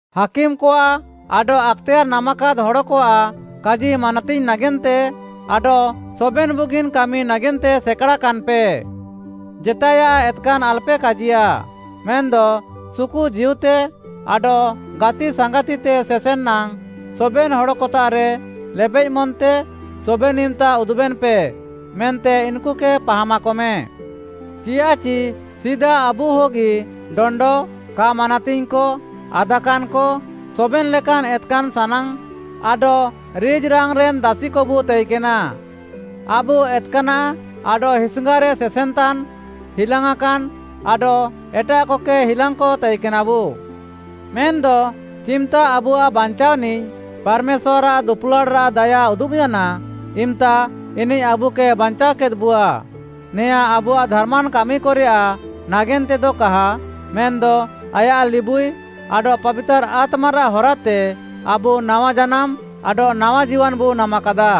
ହାକିମ୍‌କଆଃ ଆଡଃ ଆକ୍‌ତେୟାର୍‌ ନାମାକାଦ୍‌ ହଡ଼କଆଃ କାଜି ମାନାତିଙ୍ଗ୍‌ ନାଗେନ୍ତେ ଆଡଃ ସବେନ୍‌ ବୁଗିନ୍‌ କାମି ନାଗେନ୍ତେ ସେକାଡ଼ାକାନ୍‌ପେ, ଜେତାଏୟାଃ ଏତ୍‌କାନ୍‌ ଆଲ୍‌ପେ କାଜିୟା, ମେନ୍‌ଦ ସୁକୁଜୀଉତେ ଆଡଃ ଗାତିସାଙ୍ଗାତିତେ ସେସେନ୍‌ ନାଙ୍ଗ୍‌ ସବେନ୍‌ ହଡ଼କତାଃରେ ଲେବେଃମନ୍‌ତେ ସବେନ୍‌ ଇମ୍‌ତା ଉଦୁବେନ୍‌ପେ ମେନ୍ତେ ଇନ୍‌କୁକେ ପାହାମାକମେ। ଚିୟାଃଚି ସିଦା ଆବୁହଗି ଡଣ୍ଡ, କା ମାନାତିଙ୍ଗ୍‌କ, ଆଦାକାନ୍‌କ, ସବେନ୍‌ ଲେକାନ୍‌ ଏତ୍‌କାନ୍‌ ସାନାଙ୍ଗ୍‌ ଆଡଃ ରିଜ୍‌ରାଙ୍ଗ୍‌ରେନ୍‌ ଦାସିକବୁ ତାଇକେନା। ଆବୁ ଏତ୍‌କାନାଃ ଆଡଃ ହିସ୍‌ଙ୍ଗାରେ ସେସେନ୍‌ତାନ୍‌, ହିଲାଙ୍ଗ୍‌ଆଁକାନ୍‌ ଆଡଃ ଏଟାଃକକେ ହିଲାଙ୍ଗ୍‌କ ତାଇକେନାବୁ। ମେନ୍‌ଦ ଚିମ୍‌ତା ଆବୁଆଃ ବାଞ୍ଚାଅନିଃ ପାର୍‌ମେଶ୍ୱାର୍‌ଆଃ ଦୁପୁଲାଡ଼୍‌ରାଃ ଦାୟା ଉଦୁବ୍‌ୟାନା, ଇମ୍‌ତା ଇନିଃ ଆବୁକେ ବାଞ୍ଚାଅକେଦ୍‌ବୁଆ, ନେଆଁଁ ଆବୁଆଃ ଧାର୍‌ମାନ୍‌ କାମିକରେୟାଃ ନାଗେନ୍ତେତେଦ କାହା ମେନ୍‌ଦ ଆୟାଃ ଲିବୁଇ ଆଡଃ ପାବିତାର୍‌ ଆତ୍ମାରାଃ ହରାତେ ଆବୁ ନାୱା ଜାନାମ୍‌ ଆଡଃ ନାୱା ଜୀୱାନ୍‌ବୁ ନାମାକାଦା।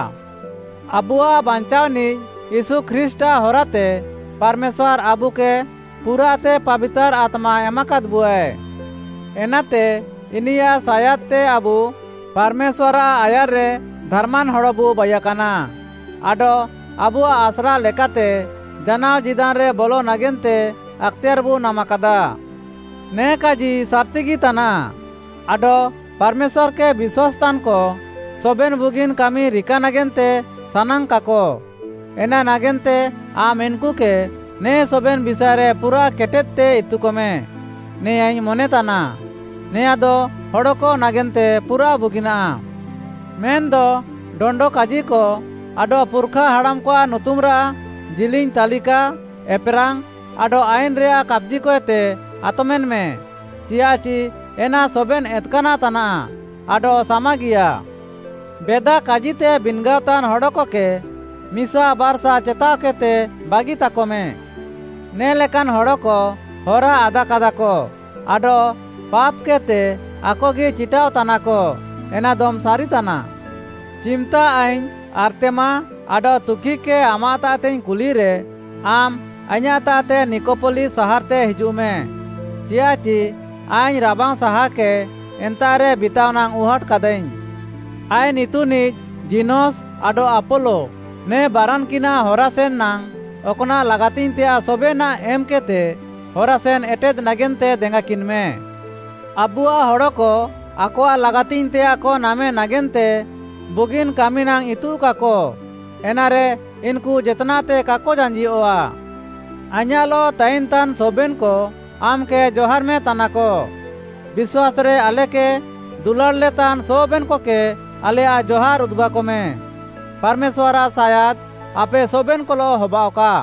ଆବୁଆଃ ବାଞ୍ଚାଅନିଃ ୟୀଶୁ ଖ୍ରୀଷ୍ଟ୍‌ଆଃ ହରାତେ ପାର୍‌ମେଶ୍ୱାର୍‌ ଆବୁକେ ପୁରାଃତେ ପାବିତାର୍‌ ଆତ୍ମା ଏମାକାଦ୍‌ବୁଆଏ। ଏନାତେ, ଇନିୟାଃ ସାୟାଦ୍‌ତେ ଆବୁ ପାର୍‌ମେଶ୍ୱାର୍‌ଆଃ ଆୟାର୍‌ରେ ଧାର୍‌ମାନ୍‌ ହଡ଼ବୁ ବାଇୟାକାନା ଆଡଃ ଆବୁଆଃ ଆସ୍ରା ଲେକାତେ ଜାନାଅ ଜୀଦାନ୍‌ରେ ବଲ ନାଗେନ୍ତେ ଆକ୍‌ତେୟାର୍‌ବୁ ନାମାକାଦା। ନେ କାଜି ସାର୍‌ତିଗି ତାନାଃ। ଆଡଃ ପାର୍‌ମେଶ୍ୱାର୍‌କେ ବିଶ୍ୱାସ୍‌ତାନ୍‌କ, ସବେନ୍‌ ବୁଗିନ୍‌ କାମି ରିକା ନାଗେନ୍ତେ ସାନାଙ୍ଗ୍‌କାକ, ଏନା ନାଗେନ୍ତେ ଆମ୍‌ ଇନ୍‌କୁକେ ନେ ସବେନ୍‌ ବିଷାଏରେ ପୁରାଃ କେଟେଦ୍‌ତେ ଇତୁକମେ, ନେଆଁଁଇଙ୍ଗ୍‌ ମନେତାନା। ନେଆଁଦ ହଡ଼କ ନାଗେନ୍ତେ ପୁରାଃ ବୁଗିନାଃ। ମେନ୍‌ଦ ଡଣ୍ଡ କାଜିକ ଆଡଃ ପୁର୍‌ଖା ହାଡ଼ାମ୍‌କଆଃ ନୁତୁମ୍‌ରାଃ ଜିଲିଙ୍ଗ୍‌ ତାଲିକା, ଏପ୍‌ରାଙ୍ଗ୍‌, ଆଡଃ ଆଇନ୍‌ରେୟାଃ କାପ୍‌ଜିକଏତେ ଆତମେନ୍‌ମେ, ଚିୟାଃଚି ଏନା ସବେନ୍‌ ଏତ୍‌କାନାଃ ତାନାଃ ଆଡଃ ସାମାଗିୟା। ବେଦା କାଜିତେ ବିନ୍‌ଗାଅତାନ୍‌ ହଡ଼କକେ ମିସା ବାର୍‌ସା ଚେତାଅକେଦ୍‌ତେ ବାଗିତାକମ୍। ନେ ଲେକାନ୍‌ ହଡ଼କ ହରାଆଦାକାଦାକ ଆଡଃ ପାପ୍‌କେଦ୍‌ତେ ଆକଗି ଚିଟାଅଃତାନାକ, ଏନାଦମ୍‌ ସାରିତାନା। ଚିମ୍‌ତା ଆଇଙ୍ଗ୍‌ ଆର୍ତ୍ତେମା ଆଡଃ ତୁଖିକ୍‌କେ ଆମାଃତାଃତେଇଙ୍ଗ୍‌ କୁଲିରେ, ଆମ୍‌ ଆଇଁୟାଃତାଃତେ ନିକପଲି ସାହାର୍‌ତେ ହିଜୁଃମେ, ଚିୟାଃଚି ଆଇଙ୍ଗ୍‌ ରାବାଙ୍ଗ୍‌ସାହାକେ ଏନ୍ତାଃରେ ବିତାଅନାଙ୍ଗ୍‌ ଉହାଟ୍‌କାଦାଇଙ୍ଗ୍‌। ଆଇନ୍‌ ଇତୁନିଃ ଜୀନସ୍‌ ଆଡଃ ଆପୋଲୋ, ନେ ବାରାନ୍‌କିନ୍‌ନାଃ ହରାସେନ୍‌ ନାଙ୍ଗ୍‌, ଅକ୍‌ନାଃ ଲାଗାତିଙ୍ଗ୍‌ତେୟାଃ ସବେନାଃ ଏମ୍‌କେଦ୍‌ତେ ହରାସେନ୍‌ ଏଟେଦ୍‌ ନାଗେନ୍ତେ ଦେଙ୍ଗାକିନ୍‌ମେ। ଆବୁଆଃ ହଡ଼କ ଆକଆଃ ଲାଗାତିଙ୍ଗ୍‌ତେୟାଃକ ନାମେ ନାଗେନ୍ତେ ବୁଗିନ୍‌ କାମି ନାଙ୍ଗ୍‌ ଇତୁଃକାକ, ଏନାରେ ଇନ୍‌କୁ ଜେତ୍‌ନାଃତେ କାକ ଜାଞ୍ଜିଅଃଆ। ଆଇଁୟାଃଲଃ ତାଇନ୍‌ତାନ୍‌ ସବେନ୍‌କ ଆମ୍‌କେ ଜହାର୍‌ମେତାନାକ। ବିଶ୍ୱାସ୍‌ରେ ଆଲେକେ ଦୁଲାଡ଼୍‌ଲେତାନ୍‌ ସବେନ୍‌କକେ ଆଲେୟାଃ ଜହାର୍‌ ଉଦୁବାକମେ। ପାର୍‌ମେଶ୍ୱାର୍‌ଆଃ ସାୟାଦ୍‌ ଆପେ ସବେନ୍‌କଲଃ ହବାଅଃକା।